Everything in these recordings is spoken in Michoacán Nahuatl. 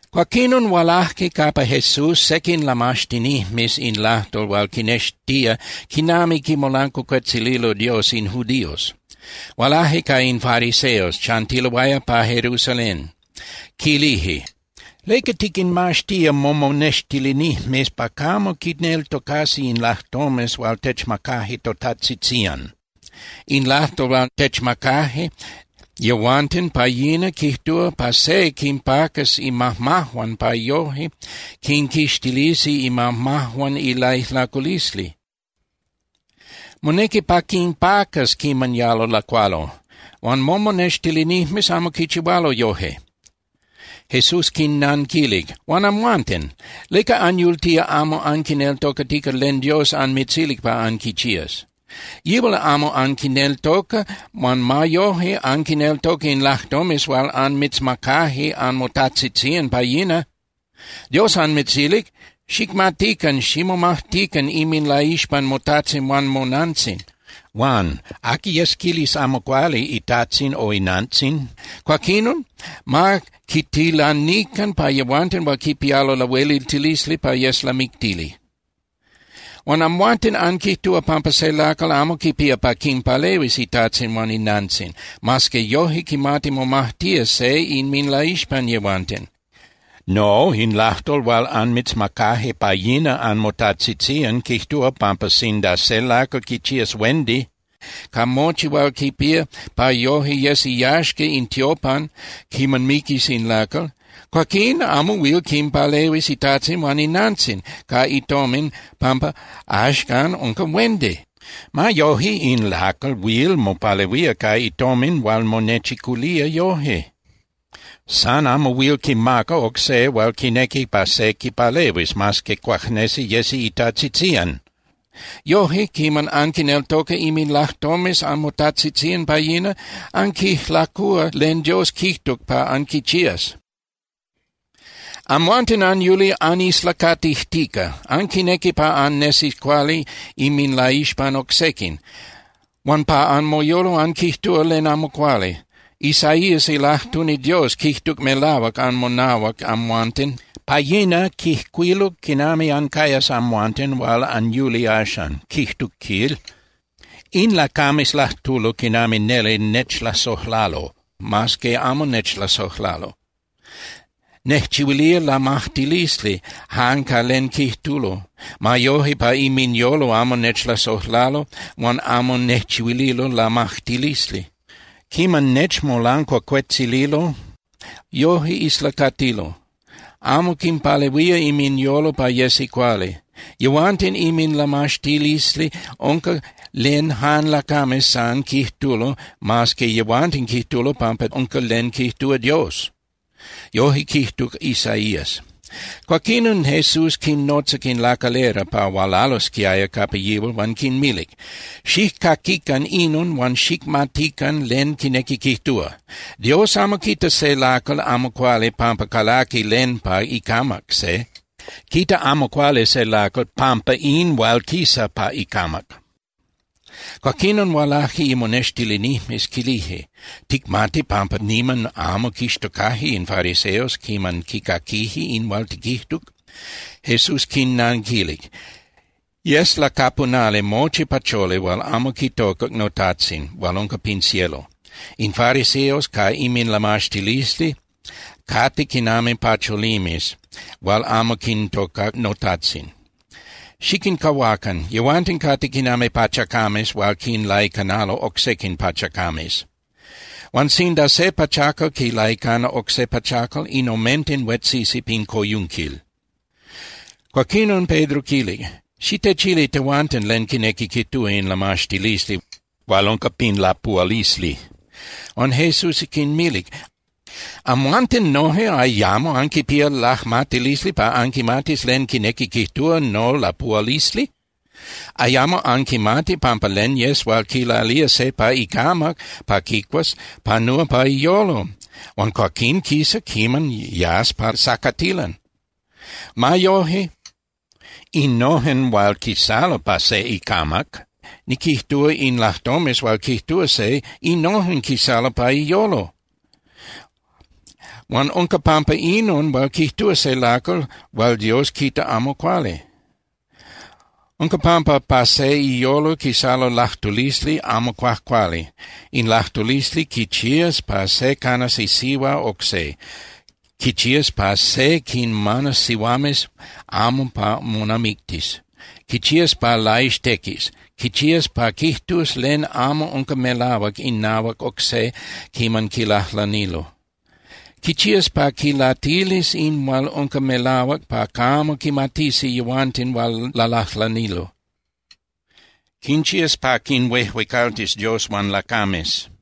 Cuaquinon hualaje capa Jesús sequin ilamaxtinijmes in lajtol hual quinnextía quinami quimolancuacuetzililo Dios in judíos. Hualaje ca in fariseos, chantiloaya pa Jerusalén, quilije: —¿Leca tiquinmaxtía momonextilinijmes pa camo quineltocasi in lajtomes hual techmacaje totajtzitzían? In lajtol hual techmacaje yehuanten pa yina quijtúa pa se quinpacas imajmajuan pa yoje quinquixtilisi imajmajuan ilaijlaculisli. Monequi pa quinpacas quiman yalo lacualo. Huan momonextilinijmes amo quichihualo yoje. Jesús quinnanquilic: —Huan amhuanten, ¿leca anyultía amo anquineltocatica len Dios anmitzilic pa anquichías? Yihual amo anquineltoca, huan ma yoje, anquineltoca in lajtomes hual anmitzmacaje anmotajtzitzían pa yina. Dios anmitzilic: “Xicmatican ximomajtican inminlaixpan motajtzin huan monantzin.” Huan: “Aqui yes quilis amo cuali itajtzin o inantzin, cuaquinon ma quitilanican pa yehuanten hual quipialo lahueliltilisli pa yes lamictili.” Huan amhuanten anquijtúa pampa se lacal amo quipía pa quinpalehuis itajtzin huan inantzin, mas que yoje quimati momajtía se inminlaixpan yehuanten. No, in lajtol hual anmitzmacaje pa yina anmotajtzitzían quijtúa pampa sinda se lacal quichías huendi ca mochi hual quipía pa yoje yes iyaxca in tiopan quiman miquis in lacal, cuaquín amo huil quinpalehuis itajtzin huan inantzin ca itomin pampa axcan unca huendi. Ma yoje in lacal huil mopalehuía ca itomin hual monechiculía yoje. San amo huil quimaca oc se hual quinequi pa se quipalehuis, mas que cuajnesi yesi itajtzitzían. Yoje, quiman anquineltoca inminlajtomes anmotajtzitzían pa yina, anquijlacúa len Dios quijtuc pa anquichías. Amhuanten anyuli anislacatijtica. Anquinequi pa annesis cuali inminlaixpan oc sequin, huan pa anmoyolo anquijtúa len amo cuali. Isaías ilajtuni Dios quijtuc melahuac anmonahuac amhuanten. Pa yina quijcuiluc quinami ancayas amhuanten hual anyuli axan, quijtuc, quil: In lacames lajtulo quinami neli nechlasojlalo, mas que amo nechlasojlalo. Nejchihuilía lamajtilisli jan ca len quijtulo. Ma yoje, pa inminyolo amo nechlasojlalo huan amo nejchihuililo lamajtilisli. Quiman nechmolancuacuetzililo, yoje islacatilo. Amo quinpalehuía inminyolo pa yesi cuali. Yehuanten inminlamaxtilisli unca len jan lacames san quijtulo mas que yehuanten quijtulo pampa unca len quijtúa Dios. Yoje quijtuc Isaías. Cuaquinon Jesús quinnotzac in lacalera pa hualalosquiaya capa yihual huan quinmilic: —Xijcaquican inon huan xicmatican len quinequi quijtúa. Dios amo quita se lacal amo cuali pampa calaqui len pa icamac se. Quita amo cuali se lacal pampa in hual quisa pa icamac. Cuaquinon hualaje imonextilinijmes, quilije: —¿Ticmati pampa niman amo quixtocaje in fariseos quiman quicaquije in hual tiquijtuc? Jesús quinnanquilic: —Yes lacapunali mochi pacholi hual amo quitocac noTajtzin hual unca pin cielo. In fariseos ca inminlamaxtilisli cate quinami pacholimes hual amo quintocac noTajtzin. Xiquincahuacan. Yehuanten cate quinami pachacames hual quinlaicanalo oc sequin pachacames. Huan sinda se pachacal quilaicana oc se pachacal, in omenten huetzisi pin coyunquil. Cuaquinon Pedro quilic: —Xitechili tehuanten len quinequi quijtúa in lamaxtilisli hual unca pin lapuhualisli. Huan Jesús quinmilic: —¿Amhuanten noje ayamo anquipía lajmatilisli pa anquimatis len quinequi quijtúa nolapuhualisli? ¿Ayamo anquimati pampa len yes hual quilalía se pa icamac pa quicuas panúa pa iyolo huan cuaquín quisa quiman yas pa sacatilan? Ma yoje, innojen hual quisalo pa se icamac, niquijtúa, in lajtomes hual quijtúa se, innojen quisalo pa iyolo. Huan unca pampa inon hual quijtúa se lacal hual Dios quita amo cuali. Unca pampa pa se iyolo quisalo lajtulisli amo cuajcuali. In lajtulisli quichías pa se canas isihua oc se. Quichías pa se quinmanas sihuames amo pa monamictis. Quichías pa laixtequis. Quichías pa quijtus len amo unca melahuac inahuac oc se quiman quilajlanilo. Quichías pa quinlatilis in hual unca melahuac pa camo quimatisi yehuanten hual lalajlanilo. Quinchías pa quinhuejuecaltis Dios huan lacames.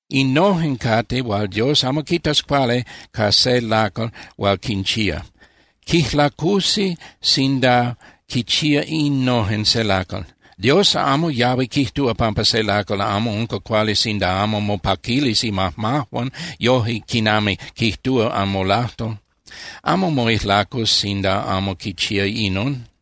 Innojen cate hual Dios amo quitas cuali ca se lacal hual quinchía. Quijlacusi sinda quichía innojen se lacal. Dios amo yahui quijtúa pampa se lacal amo unca cuali sinda amo mopaquilis imajmajuan yoje quinami quijtúa anmolajtol. Amo moijlacus sinda amo quichía inon.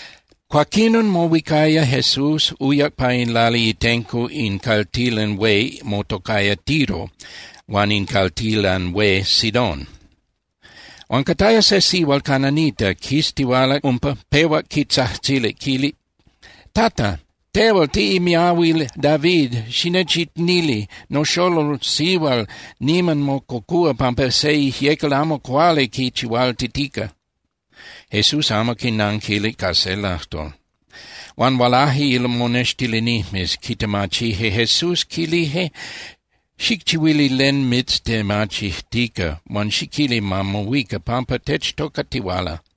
Cuaquinon mohuicaya Jesús, uyac pa in lali itenco in caltilan hué motocaya Tiro huan in caltilan hué Sidón. Huan cataya se sihual cananita quistihualac umpa, pehuac quitzajtzilic, quilic: —¡Tata, tehual tiꞌimiahuil David, xinechicnili! Noxolol sihual niman mococúa pampa se ijyecal amo cuali quichihualtitica. Jesús amo quinanquilic ca se lajtol. Huan hualaje imonextilinijmes, quitemachije Jesús, quilije: —Xicchihuili len mitztemachijtica huan xiquili ma mohuica, pampa techtocatihuala.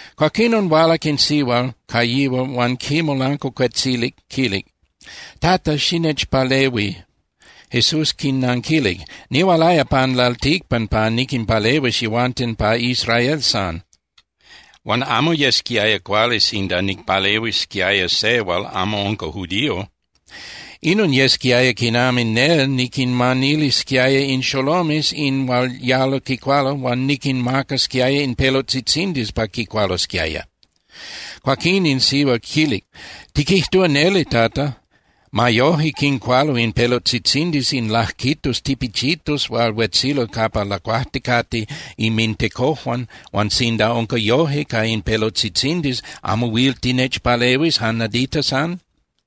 Cuaquinon hualac in sihual ca yihual huan quimolancuacuetzilic, quilic: —¡Tata, xinechpalehui! Jesús quinanquilic: —Nihualaya pan lalticpan pa niquinpalehuis yehuanten pa Israel san, huan amo yesquiaya cuali sinda nicpalehuisquiaya se hual amo unca judío. Inon yesquiaya quinami nel niquinmanilisquiaya in xolomes in hual yalo quicualo huan niquinmacasquiaya in pelotzitzindis pa quicualosquiaya. Cuaquín in sihual quilic: —Tiquijtúa neli, Tata. Ma yoje quincualo in pelotzitzindis in lajquitos tipichitos hual huetzilo capa lacuajticate inmintecojuan, huan sinda unca yoje ca in pelotzitzindis, ¿amo huil tinechpalehuis jan nadita san?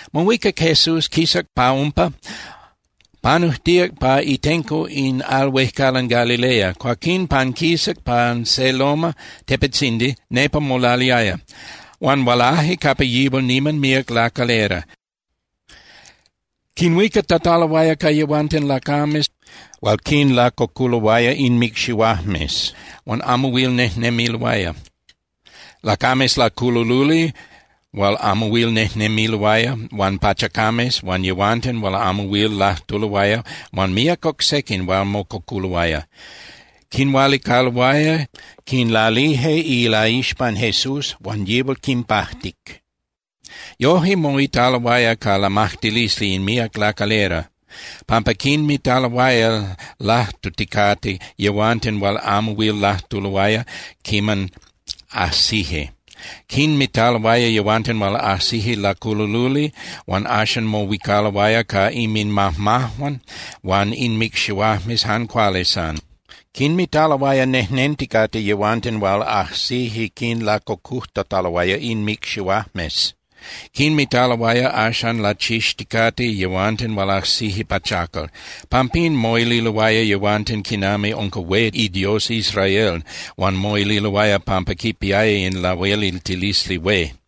Mohuicac Jesús, quisac pa umpa, panujtíac pa itenco in al huejcalan Galilea, cuaquín panquisac pan se loma (tepetzindi), nepa molaliaya. Huan hualaje capa yihual niman míac lacalera, quinhuicatataloaya ca yehuanten lacames hual quinlacoculoaya inmicxihuajmes huan amo huil nejnemiloaya, lacames laculululi hual amo huil nejnemiloaya, huan pachacames huan yehuanten hual amo huil lajtuloaya huan míac oc sequin hual mococuloaya. Quinhualicaloaya, quinlalije ilaixpan Jesús, huan yihual quinpajtic. Yoje moitaloaya ca lamajtilisli in míac lacalera, pampa quinmitaloaya lajtuticate yehuanten hual amo huil lajtuloaya quiman ajsije. Quinmitaloaya yehuanten hual ajsije laculululi huan axan mohuicaloaya ca inminmajmajuan huan inmicxihuajmes jan cuali san. Quinmitaloaya nejnenticate yehuanten hual ajsije quinlacocujtataloaya inmicxihuajmes. Quinmitaloaya axan lachixticate yehuanten hual ajsije pachacal. Pampín moililoaya yehuanten quinami unca hué iDios Israel huan moililoaya pampa quipiaya in lahueliltilisli hué.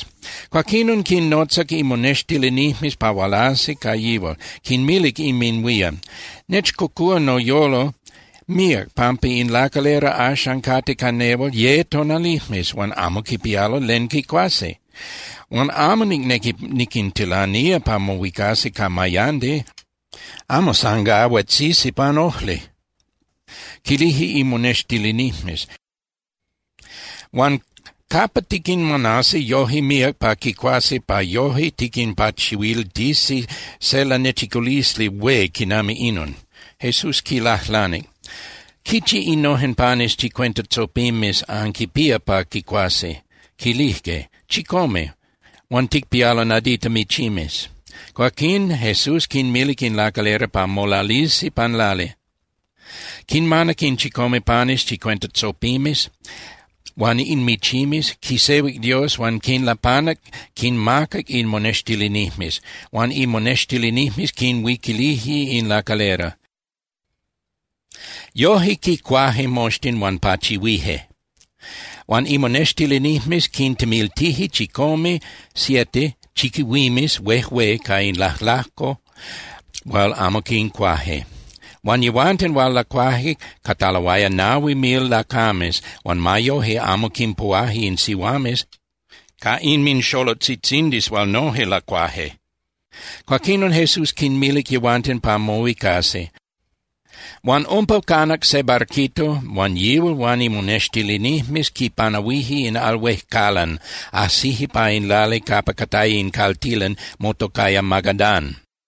Cuaquinon quinnotzac imonextilinijmes pa hualasi ca yihual, quinmilic inminhuían: —Nechcocúa noyolo míac pampa in lacalera axan cate ca nehual ye tonalijmes huan amo quipialo len quicuasi. Huan amo nicnequi niquintilanía pa mohuicasi ca mayandi, amo san gá huetzisi pan ojli. Quilije imonextilinijmes: —Huan ¿capa tiquinmanasi yoje míac pa quicuasi pa yoje tiquinpachihuiltisi se lanechiculisli hué quinami inon? Jesús quinlajlanic: —¿Quichi innojen panes chicuenta tzopimes anquipía pa quicuasi? Quilijque: —Chicome. Huan ticpialo nadita michimes. Cuaquín Jesús quinmilic in lacalera pa molalisi pan lali. Quinmanac in chicome panes chicuenta tzopimes huan in michimes, quisehuic Dios huan quinlapanac, quinmacac imonextilinijmes, huan imonextilinijmes quinhuiquilije in lacalera. Yojque quicuaje moxtin huan pachihuije. Huan imonextilinijmes quintemiltije chicome (siete) chiquihuimes huejué ca in lajlajco hual amo quincuaje. Huan yehuanten hual lacuaje cataloaya nahui mil lacames huan ma yoje amo quinpuhuaje in sihuames ca inminxolotzitzindis hual noje lacuaje. Cuaquinon Jesús quinmilic yehuanten pa mohuicasi. Huan umpa canac se barquito huan yihual huan imonextilinijmes quipanahuije in al huejcalan, ajsije pa in lali capa cataya in caltilan motocaya Magadán.